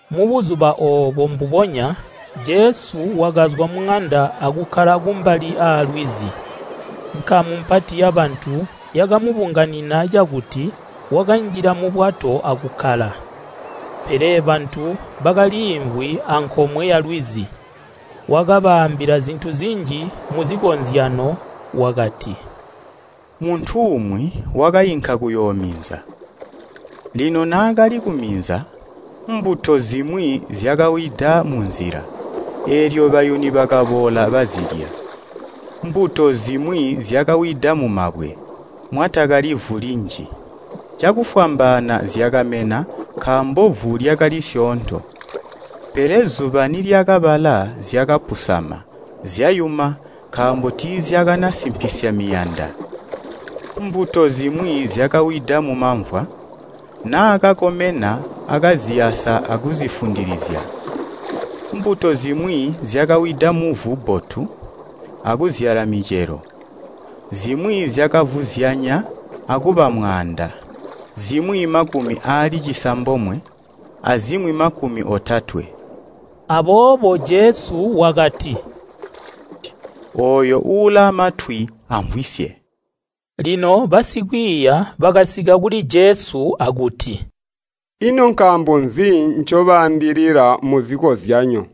Mubuzuba oobo mbubonya Jesu wakazwa muŋanda akukkala kumbali aalwizi. Nkamu mpati yabantu yakamubunganina cakuti wakanjila mubwato akukkala, pele bantu bakaliimvwi ankomwe yalwizi. Wakabaambila zintu zinji muzikozyanyo wakati, “Muntu umwi wakainka kuyoominza. Lino naakali kuminza, mbuto zimwi zyakawida munzila, eelyo bayuni bakaboola bazilya. Mbuto zimwi zyakawida mulubwe-lubwe, mwatakalivu linji, cakufwambaana zyakamena nkaambo vu lyakali syoonto. Pele zuba nilyakabala zyakapusama, zyayuma nkaambo tiizyakana simpisya miyanda. Mbuto zimwi zyakawida mumamvwa, naakakomena akaziyasa akuzifundilizya. Mbuto zimwi zyakawida muvu bbotu, akuzyala micelo. Zimwi zyakavuzyanya akuba mwaanda, zimwi makumi aali cisambomwe, azimwi makumi otatwe.” Aboobo Jesu wakati, “Ooyo ulaamatwi amvwisye.” Lino basikwiiya bakasika kuli Jesu akuti, “Ino nkaambo nzi ncobaambilila muzikozyanyo?”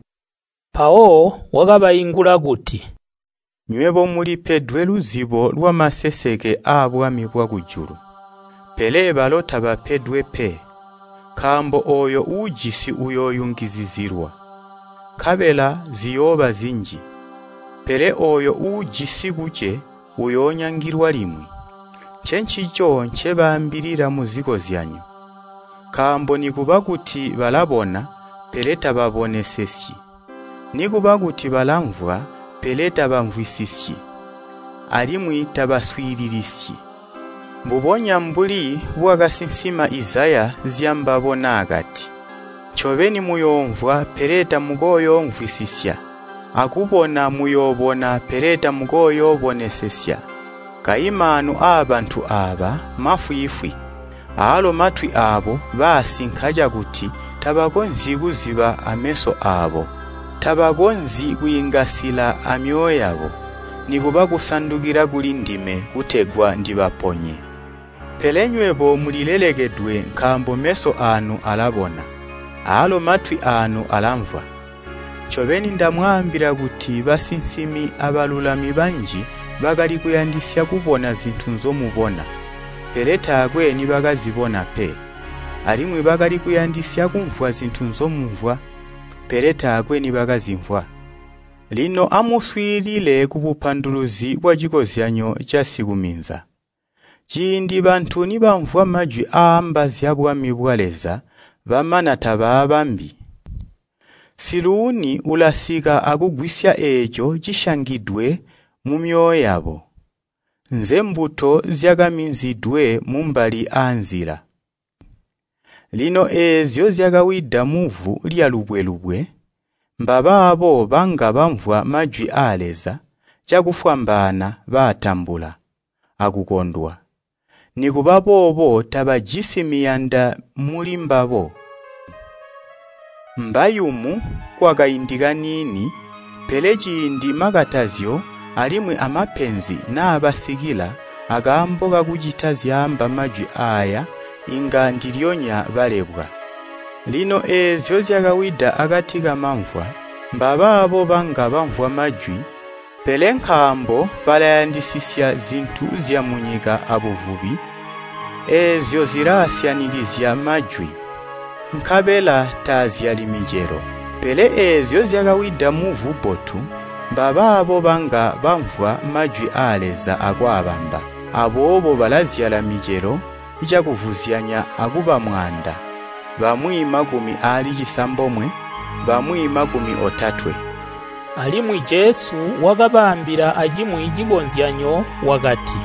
Mpawo wakabaingula kuti, “Nywebo mulipedwe luzibo lwamaseseke aabwami bwakujulu, pele balo tabapedwe pe. Nkaambo ooyo uujisi uyooyungizizilwa, nkabela ziyooba zinji, pele ooyo uujisi kuce uyoonyangilwa limwi. Ncencico ncebaambilila muzikozyanyo, nkaambo nikuba kuti balabona, pele tababonesesyi, nikuba kuti balamvwa pele tabamvwisisyi, alimwi tabaswiililisyi. Mbubonya mbuli bwakasinsima Izaya zyambabo naakati, ‘Ncobeni muyoomvwa pele tamukooyoomvwisisya, akubona muyoobona pele tamukooyoobonesesya. Kayi maanu aabantu aaba mafwiifwi, aalo matwi aabo baasinka cakuti tabakonzyi kuziba ameso aabo. Tabakonzyi kwiingasila amyoyo yabo, nikuba kusandukila kuli ndime kutegwa ndibaponye.’ Pele nywebo mulilelekedwe nkaambo meso aanu alabona, aalo matwi aanu alamvwa. Ncobeni ndamwaambila kuti basinsimi abalulami banji bakali kuyandisya kubona zintu nzomubona, pele taakwe nibakazibona pe. Alimwi bakali kuyandisya kumvwa zintu nzomumvwa, pele taakwe nibakazimvwa. “Lino amuswiilile kubupanduluzi bwacikozyanyo casikuminza. Ciindi bantu nibamvwa majwi aaamba zya bwami bwa Leza bamana tabaabambi, Siluuni ulasika akugwisya eeco cisyangidwe mumyoyo yabo. Nzembuto zyakaminzidwe mumbali aanzila. Lino eezyo zyakawida muvu lyalubwe-lubwe, mbabaabo banga bamvwa majwi aa Leza, cakufwambaana baatambula akukondwa. Nikuba boobo tabajisi miyanda mulimbabo, mbayumu kwakaindi kaniini, pele ciindi makatazyo alimwi a mapenzi naabasikila akaambo kakucita zyaamba majwi aaya inga ndilyonya balebwa. Lino eezyo zyakawida akati kamamvwa, mbabaabo banga bamvwa majwi, pele nkaambo balayandisisya zintu zyamunyika abuvubi, eezyo zilaasyanikizya majwi, nkabela taazyali micelo. Pele eezyo zyakawida muvu bbotu, mbabaabo banga bamvwa majwi aa Leza akwaabamba. Aboobo balazyala micelo cakuvuzyanya akuba mwaanda, bamwi makumi aali cisambomwe, bamwi makumi otatwe.” Alimwi Jesu wakabaambila acimwi cikozyanyo wakati,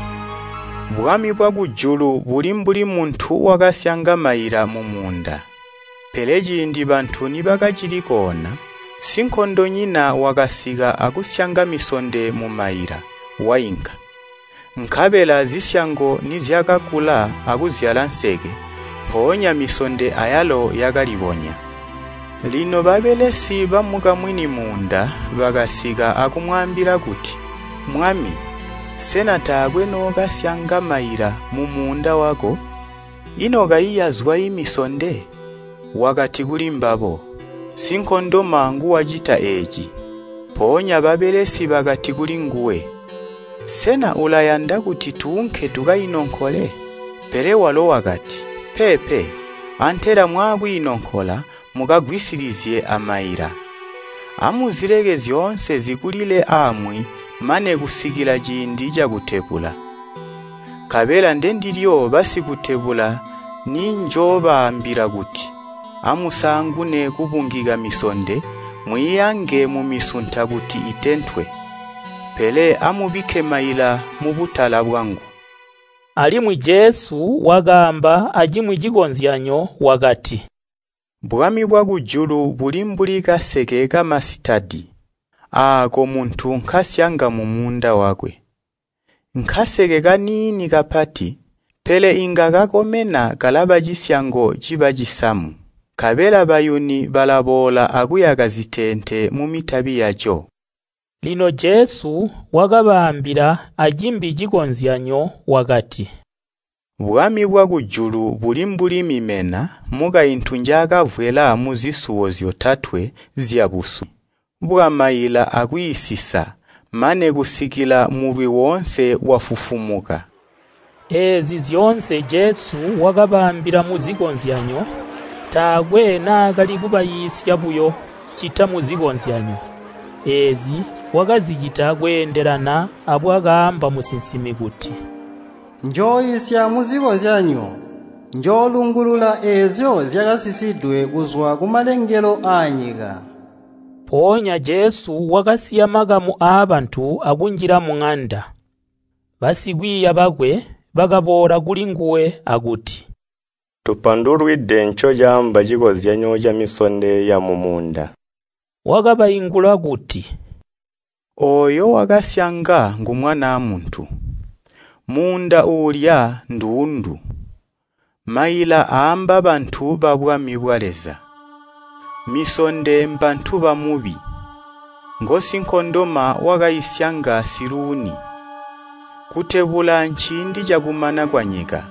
“Bwami bwakujulu buli mbuli muntu wakasyanga maila mumuunda. Pele ciindi bantu nibakacili koona, sinkondonyina wakasika akusyanga misonde mumaila, wainka. Nkabela zisyango nizyakakula akuzyala nseke, mpoonya misonde ayalo yakalibonya. Lino babelesi bamukamwini muunda bakasika akumwaambila kuti, ‘Mwami, sena taakwe nookasyanga maila mumuunda wako? Ino kayi yazwayi misonde?’ Wakati kulimbabo, ‘Sinkondoma nguwacita eeci!’ Mpoonya babelesi bakati kulinguwe, ‘Sena ulayanda kuti tuunke tukainonkole?’ Pele walo wakati, ‘Peepe, antela mwaakwiinonkola mukagwisilizye amaila. Amuzileke zyoonse zikulile aamwi mane kusikila ciindi cakutebula. Nkabela ndendilyo basikutebula ninjoobaambila kuti, Amusaangune kubungika misonde mwiiange mumisunta kuti itentwe. Pele amubikke maila mubutala bwangu.’” Alimwi Jesu wakaamba acimwi cikozyanyo wakati, “Bwami bwakujulu buli mbuli kaseke kamasitadi, aako muntu nkasyanga mumuunda wakwe. Nkaseke kaniini kapati, pele inga kakomena zisyango akuba cisamu. Nkabela bayuni balaboola akuyaka ziteente mumitabi yaco.” Lino Jesu wakabaambila acimbi cikozyanyo wakati, “Bwami bwakujulu buli mbuli mimena mukaintu njaakavwela muzisuwo zyotatwe zyabusu bwamaila akwiisisa, mane kusikila mulwi woonse wafufumuka.” Eezi zyoonse Jesu wakabaambila muzikozyanyo. Taakwe naakali kubaiisya buyo ccita muzikozyanyo. Eezi wakazicita kweendelana abwakaamba musinsimi kuti, “Njooisya muzikozyanyo, njoolungulula eezyo zyakasisidwe kuzwa kumalengelo aanyika.” Mpoonya Jesu wakasiya makamu aabantu akunjila muŋanda. Basikwiiya bakwe bakaboola kulinguwe akuti, “Tupandulwide ncocaamba cikozyanyo camisonde yamumuunda.” Wakabaingula kuti, “Ooyo wakasyanga ngu Mwanaa Muntu. Muunda uulya nduundu, maila aamba bantu babwami bwa Leza. Misonde mbantu ba Mubi. Ngosinkondoma wakaisyanga Siluuni. Kutebula nciindi cakumana kwanyika.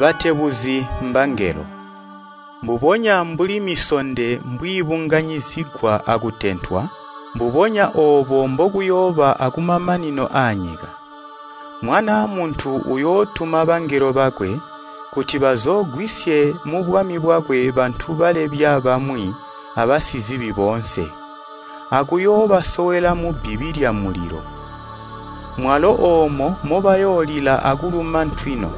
Batebuzi mbangelo. Mbubonya mbuli misonde mbwiibunganyizigwa akutentwa, mbubonya oobo mbokuyooba akumamanino aanyika. Mwanaa Muntu uyootuma bangelo bakwe, kuti bazoogwisye mubwami bwakwe bantu balebya bamwi abasizibi boonse, akuyoobasowela mubbibi lyamulilo. Mwalo oomo mobayoolila akuluma ntwino.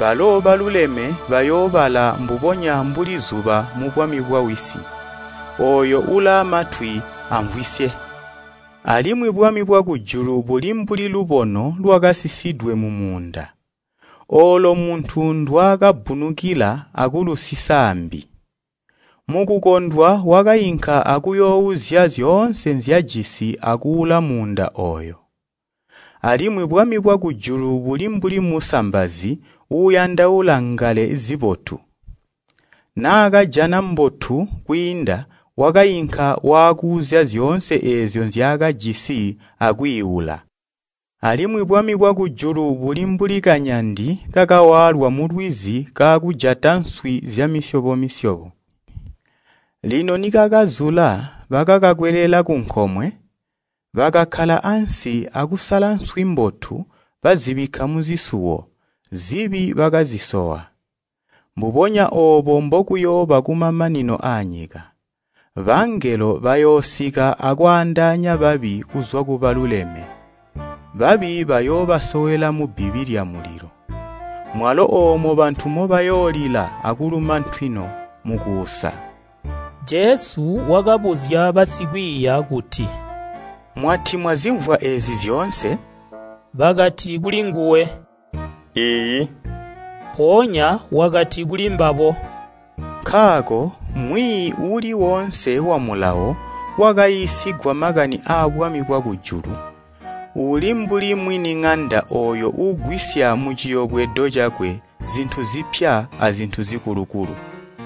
Balo baluleme bayoobala mbubonya mbuli zuba mubwami bwa Wisi. Ooyo ulaamatwi amvwisye. “Alimwi bwami bwakujulu buli mbuli lubono lwakasisidwe mumuunda, oolo muntu ndwaakabbunukila akulusisa aambi. Mukukondwa wakainka akuyoouzya zyoonse nzyajisi akuula muunda ooyo. “Alimwi bwami bwakujulu buli mbuli musambazi uuyandaula ngale zibotu. Naakajana mbotu kwiinda wakainka waakuuzya zyoonse eezyo nzyaakajisi akwiiula. “Alimwi bwami bwakujulu buli mbuli kanyandi kakawaalwa mulwizi kaakujata nswi zyamisyobo-misyobo. Lino nikakazula bakakakwelela kunkomwe. Bakakkala ansi akusala nswi mbotu bazibikka muzisuwo, zibi bakazisowa. Mbubonya oobo mbokuyooba kumamanino aanyika. Bangelo bayoosika akwaandaanya babi kuzwa kubaluleme, babi bayoobasowela mubbibi lyamulilo. Mwalo oomo bantu mobayoolila akuluma ntwino mukuusa.” Jesu wakabuzya basikwiiya kuti, “Mwati mwazimvwa eezi zyoonse?” Bakati kulinguwe, “Iiyi.” Mpoonya wakati kulimbabo, “Nkaako mwiiyi uuli woonse wamulawo wakaiisigwa makani aabwami bwakujulu uli mbuli mwiniŋanda ooyo uugwisya muciyobwedo cakwe zintu zipya azintu zikulukulu.”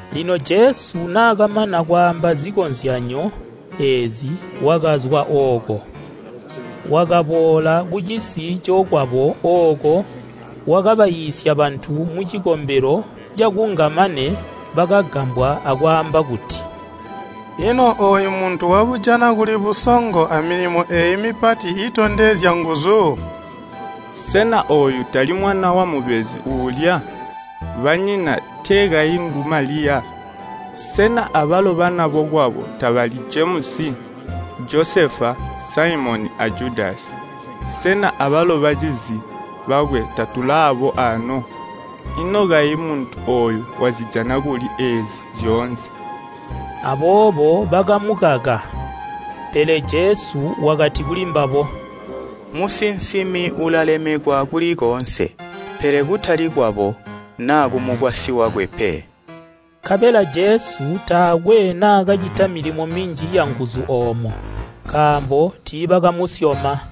Lino Jesu naakamana kwaamba zikozyanyo eezi, wakazwa ooko, wakaboola kucisi cokwabo ooko wakabaiisya bantu mucikombelo cakunga mane bakagambwa akwaamba kuti, “Ino ooyu muntu wabujana kuli busongo amilimo eeyi mipati iitondezya nguzu? Sena ooyu tali mwana wamubezi uulya? Banyina, tee kayi ngu Maliya? Sena abalo bana bokwabo tabali Jemusi, Josefa, Saimoni a Judasi? Sena abalo bacizi bakwe tatulaabo aano? Ino kayi muntu ooyu wazijana kuli eezi zyoonse?” Aboobo bakamukaka. Pele Jesu wakati kulimbabo, “Musinsimi ulalemekwa kuli koonse, pele kutali kwabo naa kumukwasyi wakwe pe.” Nkabela Jesu taakwe naakacita milimo minji yanguzu oomo, nkaambo tiibakamusyoma.